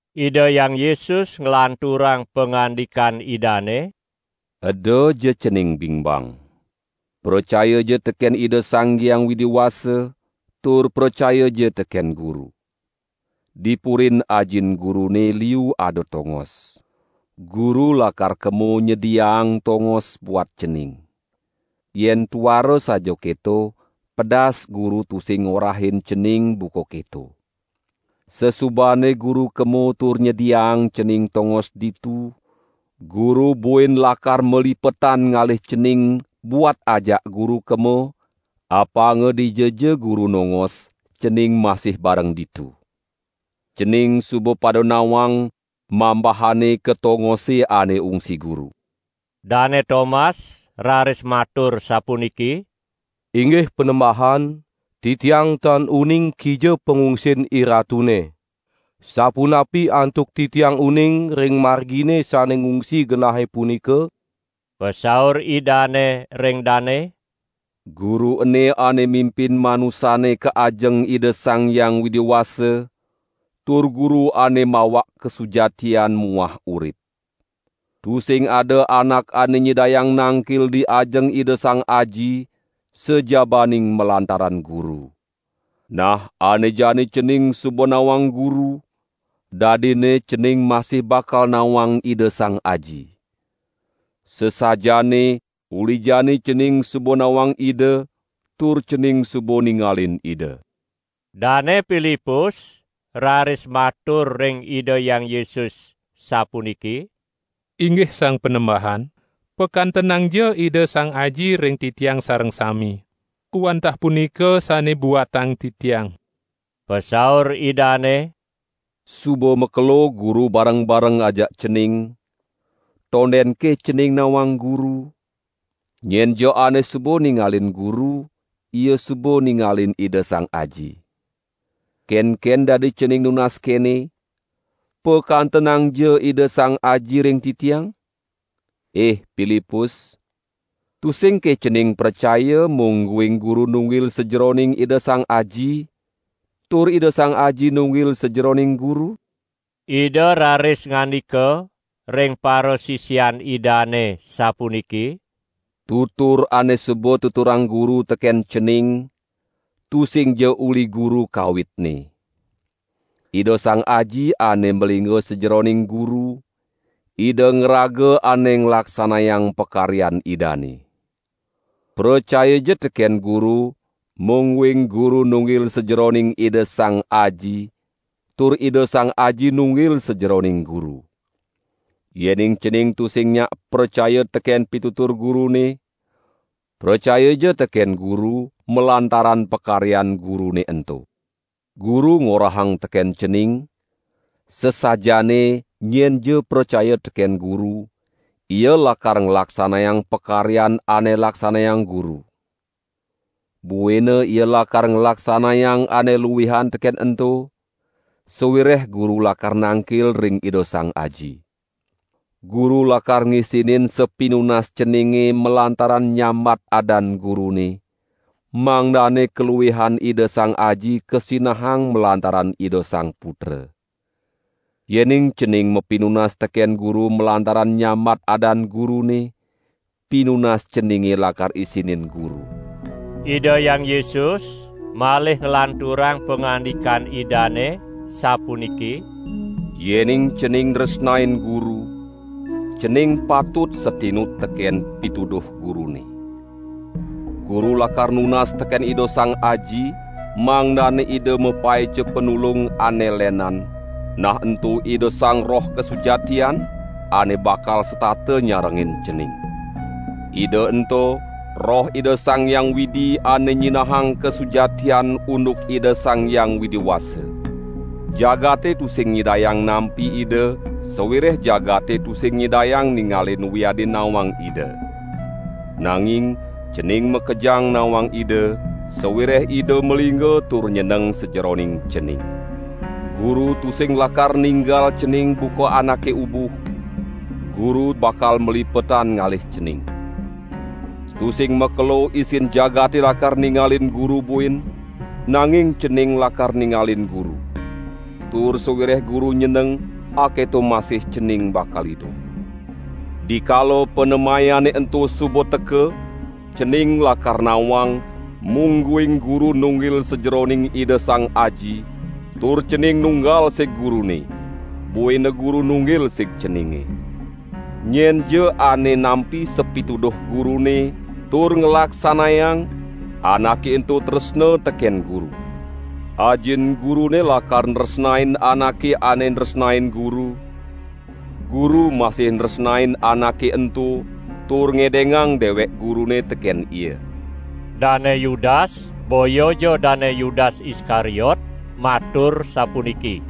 Ida Hyang Yesus nglanturang pangandikan Idane: "Edaja cening bingbang. Pracayaja teken Ida Sang Hyang Widi Wasa tur pracayaja teken Guru. Di purin Ajin Gurune liu ada tongos. Guru lakar kema nyediaang tongos buat cening. Yen tuara saja keto, pedas Guru tusing ngorahin cening buka keto. Sasubane Guru kema tur nyediaang cening tongos ditu, Guru buin lakar malipetan ngalih cening buat ajak Guru kema, apanga dijaja Guru nongos cening masih bareng ditu. Cening suba pada nawang, mambahane ka tongose ane ungsi Guru." Dane Tomas raris matur sapuniki: "Inggih Panembahan, titiang tan uning kija pangungsin IRatune; sapunapi antuk titiang uning ring margine sane ngungsi genahe punika?" Pasaur Idane ring dane: "Guru ene ane mimpin manusane ka ajeng Ida Sang Hyang Widi Wasa, tur Guru ane mawak kasujatian muah urip. Tusing ada anak ane nyidayang nangkil di ajeng Ida Sang Aji sajabaning malantaran Guru. Nah, ane jani cening suba nawang Guru, dadinne cening masih bakal nawang Ida Sang Aji; sasajaane uli jani cening suba nawang Ida tur cening suba ningalin Ida." Dane Pilipus raris matur ring Ida Hyang Yesus sapuniki: "Inggih Sang Panembahan, pakantenangja Ida Sang Aji ring titiang sareng sami; wantah punika sane buatang titiang!" Pasaur Idane: "Suba makelo Guru bareng-bareng ajak cening; tondenke cening nawang Guru? Nyenja ane suba ningalin Guru, ia suba ningalin Ida Sang Aji. Kenken dadi cening nunas kene: 'Pakantenangja Ida Sang Aji ring titiang'? Ih Pilipus, tusingke cening pracaya mungguing Guru nunggil sajeroning Ida Sang Aji tur Ida Sang Aji nunggil sajeroning Guru?" Ida raris ngandika ring parasisian Idane sapuniki: "Tutur ane suba tuturang Guru teken cening, tusingja uli Guru kawitne. Ida Sang Aji ane malingga sajeroning Guru, Ida ngraga ane nglaksanayang pakaryan Idane. Pracayaja teken Guru mungguing Guru nunggil sajeroning Ida Sang Aji tur Ida Sang Aji nunggil sajeroning Guru. Yening cening tusing nyak pracaya teken pitutur Gurune, pracayaja teken Guru, malantaran pakaryan Gurune ento. Guru ngorahang teken cening: sasajaane nyenja pracaya teken Guru, ia lakar nglaksanayang pakaryan ane laksanayang Guru. Buina ia lakar nglaksanayang ane luihan teken ento, sawireh Guru lakar nangkil ring Ida Sang Aji. Guru lakar ngisinin sapinunas ceninge malantaran nyambat adan Gurune, mangdane kaluihan Ida Sang Aji kasinahang malantaran Ida Sang Putra. Yening cening mapinunas teken Guru malantaran nyambat adan Gurune, pinunas ceninge lakar isinin Guru." Ida Hyang Yesus malih nglanturang pangandikan Idane sapuniki: "Yening cening nresnain Guru, cening patut satinut teken pituduh Gurune. Guru lakar nunas teken Ida Sang Aji, mangdane Ida mapaica Panulung ane lenan, nah ento Ida Sang Roh kasujatian, ane bakal setata nyarengin cening. Ida ento Roh Ida Sang Hyang Widi ane nyinahang kasujatian unduk Ida Sang Hyang Widi Wasa. Jagate tusing nyidayang nampi Ida sawireh jagate tusing nyidayang ningalin wiadin nawang Ida. Nanging cening makejang nawang Ida, sawireh Ida malingga tur nyeneng sajeroning cening. Guru tusing lakar ninggal cening buka anake ubuh; Guru bakal malipetan ngalih cening. Tusing makelo isin jagate lakar ningalin Guru buin, nanging cening lakar ningalin Guru; tur sawireh Guru nyeneng, aketo masih cening bakal idup. Dikala panemayane ento suba teka, cening lakar nawang mungguing Guru nunggil sajeroning Ida Sang Aji, tur cening nunggal sig Gurune, buina Guru nunggil sig ceninge. Nyenja ane nampi sapituduh Gurune tur nglaksanayang anake ento tresna teken Guru. Ajin Gurune lakar nresnain anake ane nresnain Guru; Guru masih nresnain anake ento tur ngedengang dewek Gurune teken ia." Dane Yudas, (boyaja Dane Yudas Iskariot), matur sapuniki: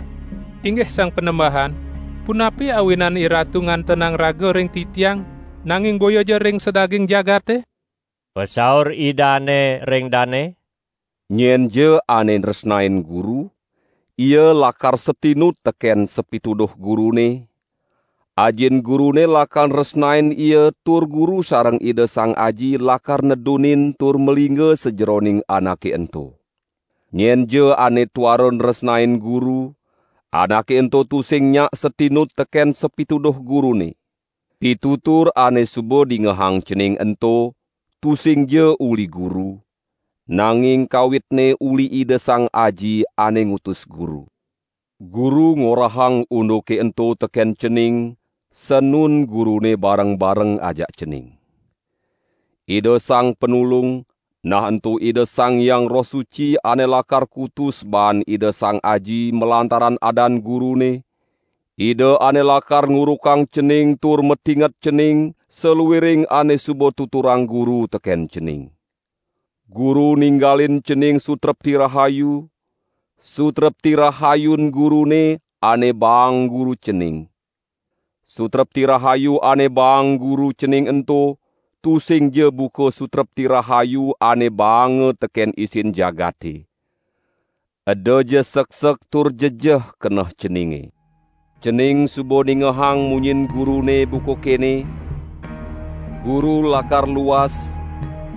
"Inggih Sang Panembahan, punapi awinan IRatu ngantenang raga ring titiang, nanging boyaja ring sadaging jagate?" Pasaur Idane ring dane: "Nyenja ane nresnain Guru, ia lakar satinut teken sapituduh Gurune, Ajin Gurune lakar nresnain ia tur Guru sareng Ida Sang Aji lakar nedunin tur malingga sajeroning anake ento. Nyenja ane tuara nresnain Guru, anake ento tusing nyak satinut teken sapituduh Gurune. Pitutur ane suba dingehang cening ento tusingja uli Guru, nanging kawitne uli Ida Sang Aji, ane ngutus Guru. Guru ngorahang unduke ento teken cening sanun Gurune bareng-bareng ajak cening. Ida Sang Panulung, nah ento Ida Sang Hyang Roh Suci ane lakar kutus baan Ida Sang Aji malantaran adan Gurune, Ida ane lakar ngurukang cening tur matinget cening saluiring ane suba tuturang Guru teken cening. Guru ninggalin cening sutrepti rahayu, sutrepti rahayun Gurune ane baang Guru cening. Sutrepti rahayu ane baang Guru cening ento, tusingja buka sutrepti rahayu ane baanga teken isin jagate. Edaja seksek tur jejeh keneh ceninge. Cening suba ningehang munyin Gurune buka kene: 'Guru lakar luas,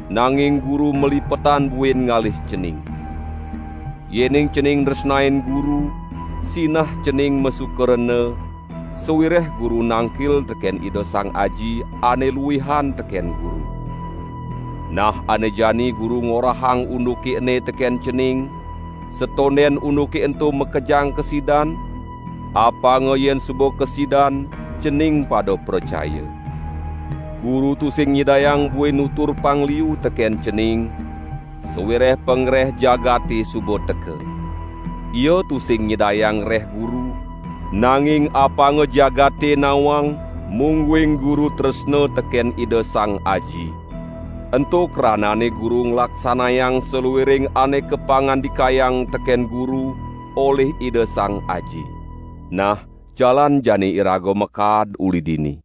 nanging Guru malipetan buin ngalih cening.' Yening cening nresnain Guru, sinah cening masuka rena, sawireh Guru nangkil teken Ida Sang Aji, ane luihan teken Guru. Nah ane jani Guru ngorahang unduke ene teken cening, satonden unduke ento makejang kasidan, apanga yen suba kasidan, cening pada pracaya. Guru tusing nyidayang buin nutur pang liu teken cening sawireh pangreh jagate suba teka. Ia tusing nyidayang ngreh Guru, nanging apanga jagate nawang mungguing Guru tresna teken Ida Sang Aji; ento kranane Guru nglaksanayang saluiring ane kapangandikayang teken Guru olih Ida Sang Aji. Nah jalan jani iraga makaad uli dini!"